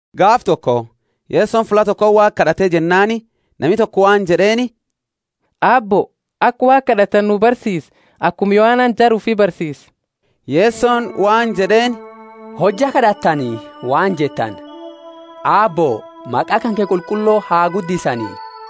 Gaafa toko Yesoni fulla tokoti Waaqa kad'ate jennaani nami toko waan jed'eeni, Aabbo, aka Waaqa kad'atani nu barsiisi, akuma Yohanani jara ufi barsiise. Yesoni waan jed'eeni, Hojja kad'attani waan jettani, Aabbo, maqa kanke qulqullo ha guddisani;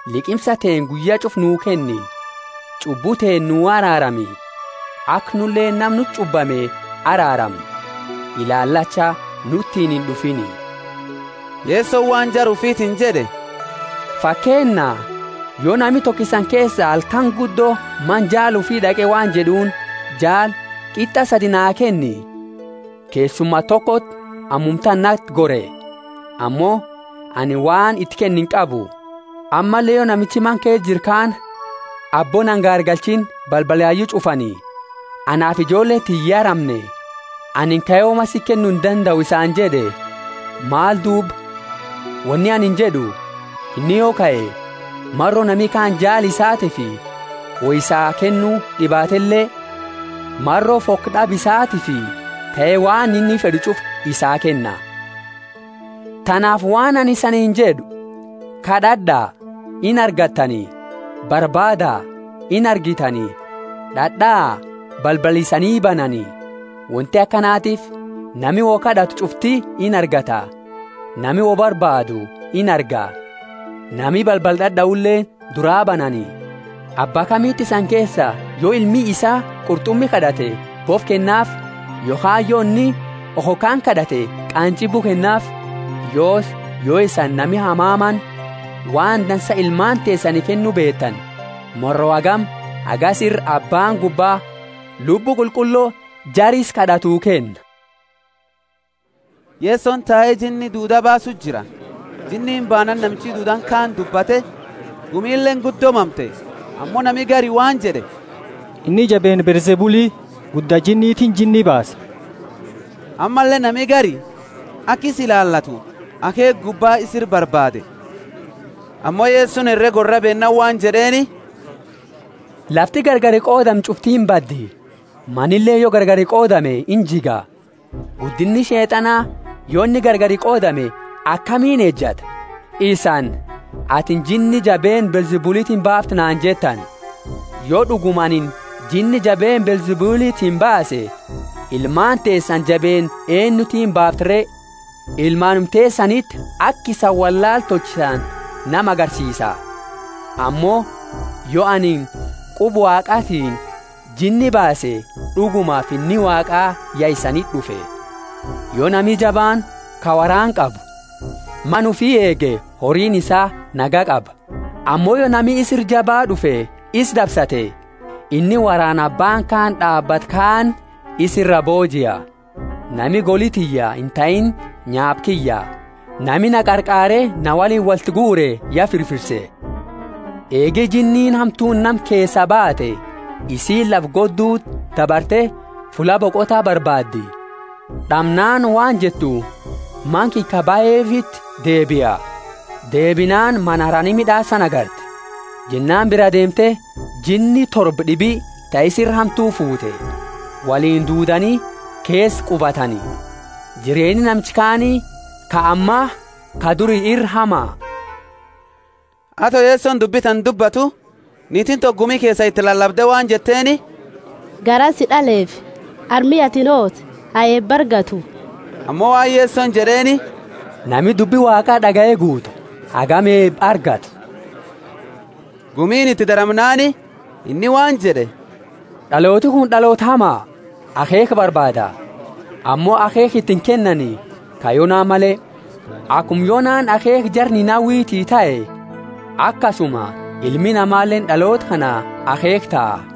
liqimsa teenna guyya ch'ufa nuu kennni. Ch'ubbu teenna nu araarami, aka nuleeni nama nuti ch'ubbame araaramnu. Ilaalacha nutiini ind'ufiini. Yesoni waan jara ufitiini jed'e, fakeenna, Yo nami toko isani keesa halkani guddo mana jaala ufi d'aqe waan jed'uuni, Jaali, qit'a sadi naa kenni. Keessuma tokoti ammumatana nati gore, ammo anini waan iti kennu inqabu. Ammalle yo namichi mana keesa jiru kaani, Aabbo na ingaargalchiini balbala yayu ch'ufani, anaafi ijoolleeni tiyya ya ramne, anini kae woma siti kennu indandau isaani jed'e. Maal duuba? Woni anini jed'u, inni yo kae, maro nami kaani jaala isaatiifi woi isaa kennu d'ibaatele, maro fokd'aba isaatiifi kae waan inni fed'u ch'ufa isaa kenna. Tanaafi waan anini isaniini jed'u, Kad'ad'a, inargattani; barbaada, inargitani; d'ad'aa, balbala isanii banani. Wonti akanatiifi nami wo kad'atu ch'ufti inargata, nami woi barbaadu, inarga; nami balbala d'ad'aule duraa banani. Abba kamiti isani keesa, yo ilmi isaa qurt'umi kad'ate bofa kennaafi? Yokhaani yo inni okhokaani kad'ate qaanjibu kennaafi? Yoosi, yo isani nami hamamaani, waan dansa ilmaani teesani kennu beetani, maro hagami hagasi ira Abbaani gubbaa Lubbu Qulqullo jara isa kad'atu kenna? Yesoni tae jinni duuda baasu jira; jinniini baanaani namichi duudani kaani dubbate, gumileeni guddo mamte. Ammo nami gari waan jed'e, Inni jabeenna Beelzebuli, gudda jinnitiini jinni baasa. Ammalle nami gari, aka isa ilaalatu akheekha gubba isa ira barbaade. Ammo Yesoni herega worraa beennaani waan jed'eeni, Lafti gargari qoodamte ch'ufti imbaddi; manileeni yo gargari qoodame injiga. Guddinni Sheet'ana, yo inni gargari qoodame, akamiini ejata? Isani, Atini jinni jabeenna Beelzebulitiini baafta naani jettani. Yo d'uguma anini jinni jabeenna Beelzebulitiini baase, ilmaani teesani jabeenna eennutiini baafti re? Ilmaanuma teesaniti aka isani wollaala tolchitani nama agarsiisa! Ammo, yo anini quba Waaqatiini jinni baase, d'uguma Finni Waaqa ya isaniti d'ufe. Yo nami jabaani, ka woraana qabu, mana ufi eege horiini isaa nagaya qaba. Ammo yo nami isa ira jaba d'ufe isa dabsate, inni woraana abbaani kaani d'aabatu kaani isa iraa boojia. Nami goli tiyya intahiini nyaapa kiyya; nami na qarqaare na woliini woltinguure ya firfirse. Eegi jinniini hamtuuni nama keesaa baate, isiini lafa godduti dabarte fulla boqota barbaaddi; d'amnaani waan jettu, Mana kiyya ka bahefiti deebia. Deebinaani mana harani mid'aasani agarti. Jennaani biraa deemte, jinni torba d'ibi ta isi ira hamtu fuute, woliini duudani keesa qubatani. Jireenni namicha kaani ka ammaa ka duri ira hama. Ato Yesoni dubbi tana dubbatu, niitiini toko gumi keesa iti lalabde waan jetteeni, Garaa si d'aleefi harmi atini hoote ha eeba argatu! Ammo waan Yesoni jed'eeni, Nami dubbi Waaqa d'agaye guutu, ha hagami eeba argatu! Gumiini iti daramnaani, inni waan jed'e, D'alooti kuni d'aloota hama! Akheekha barbaada, ammo akheekha iti inkennani, ka Yona male. Akuma Yonaani akheekha jara Ninawiti tahe, akasuma Ilmi Namaleeni d'aloota kana akheekha taha.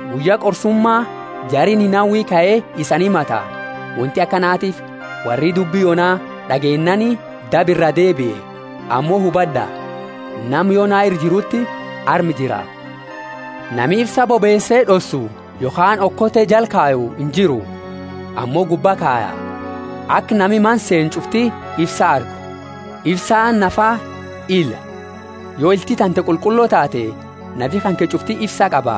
Guyya qorsuma jari Ninawi kae isani himata. Wonti akanatiifi worri dubbi Yona d'ageennaani daba iraa deebie; ammo hubad'a, nama Yona ira jiruti arma jira. Nami ifsa bobeese d'ossu yokhaani okote jala kayu injiru, ammo gubba kaya, aka nami mana seenu ch'ufti ifsa argu. Ifsaani nafaa ila; yo ilti tante qulqullo taate, nafi kanke ch'ufti ifsa qaba;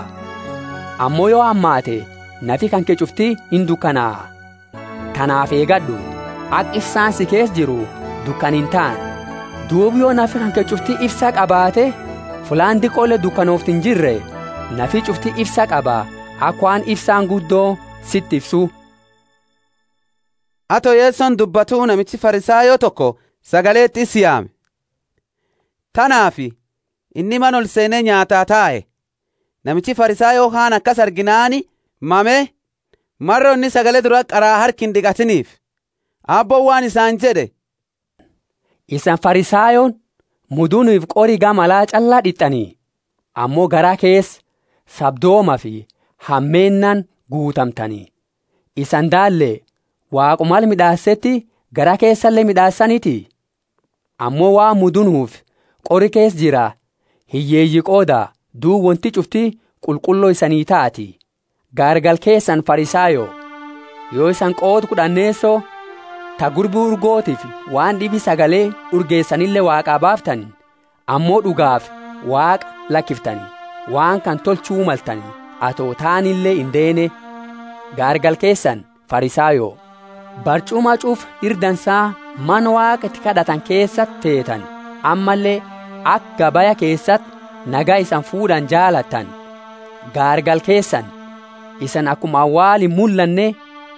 ammo yo hamaatte nafi kanke ch'ufti indukanaa. Tanaafi eegad'u, aka ifsaani si keesa jiru dukana intaane. Duuba yo nafi kanke ch'ufti ifsa qabaate fullaani diqoole dukanooftu injirre, nafi ch'ufti ifsa qaba, aka waan ifsaani guddo siti ifsu. Ato Yesoni dubbatu namichi Farisayo toko sagaleti isa yaame; tanaafi inni mana olseene nyaataa tae. Namichi Farisayo kaani akasi arginaani mame, maro inni sagale durati qara harka ind'iqatiniifi. Aabbooni waan isaani jed'e, Isani Farisayooni mudunufi qori gama ala ch'alla d'it'ani, ammo garaa keesa sabdoomafi hameennaani guutamtani. Isani daalle, Waaquma ala mid'aaseti garaa keesale mid'aasaniti? Ammo waan mudunufi qori keesa jira hiyyeeyii qooda, duuba wonti ch'ufti qulqullo isanii taati. Gaargala keesani Farisayo! Yo isani qooda kud'anneeso ta gurbi urgotiifi waan d'ibi sagaleeni urgeesanile Waaqa baaftani, ammo d'ugaafi Waaqa lakiftani, waan kana tolchu maltani ato taanile indeene. Gaargala keesani, Farisayo! Barch'uma ch'ufa ira dansa mana Waaqa iti kad'atani keesati feetani, ammalle aka gabaya keesati nagaya isani fuud'ani jaalattani. Gaargala keesani! Isani akuma awaala imullanne,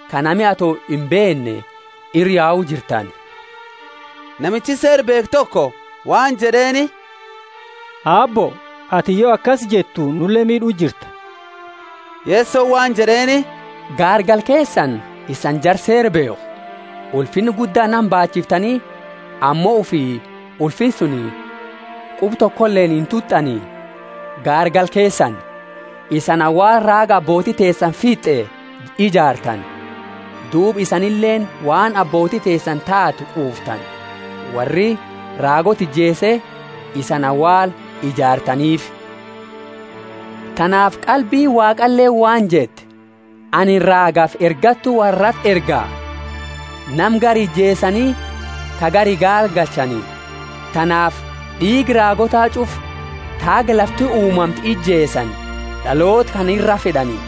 ka nami ato imbeenne ira yau jirtani. Namichi Seera beekhu toko waan jed'eeni, Aabbo, atini yo akasi jettu nule miid'u jirta. Yesoni waan jed'eeni, Gaargala keesani, isani jara Seera beekhu! Ulfinna gudda nama, baachiftani, ammo ufi ulfinna suni quba tokoleeni intut'ani. Gaargala keesani! Isani awaala raaga ababooti teesani fitt'e ijaartani. Duuba isanileeni waan ababooti teesani taate quuftani; worri raagoota ijeese, isani awaala ijaartaniifi. Tanaafi Qalbiini Waaqaleeni waan jette, Anini raagafi ergattu worrati erga; nama gari ijeesani, ka gari gaargalchani. Tanaafi d'iiga raagoota ch'ufa, ta haga lafti uumamte ijeesani, d'aloota kana iraa fed'ani,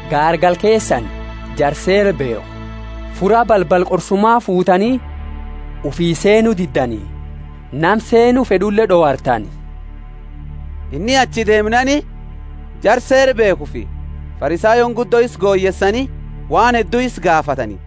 Gaargala keesani, jara Seera beekhu! Fura balbala qorsuma fuutani; ufii seenu diddani, nama seenu fed'ule d'owartani. Inni achi deemnaani, jara Seera beekhufi Farisayooni guddo isa goyeesani waan heddu isa gaafatani,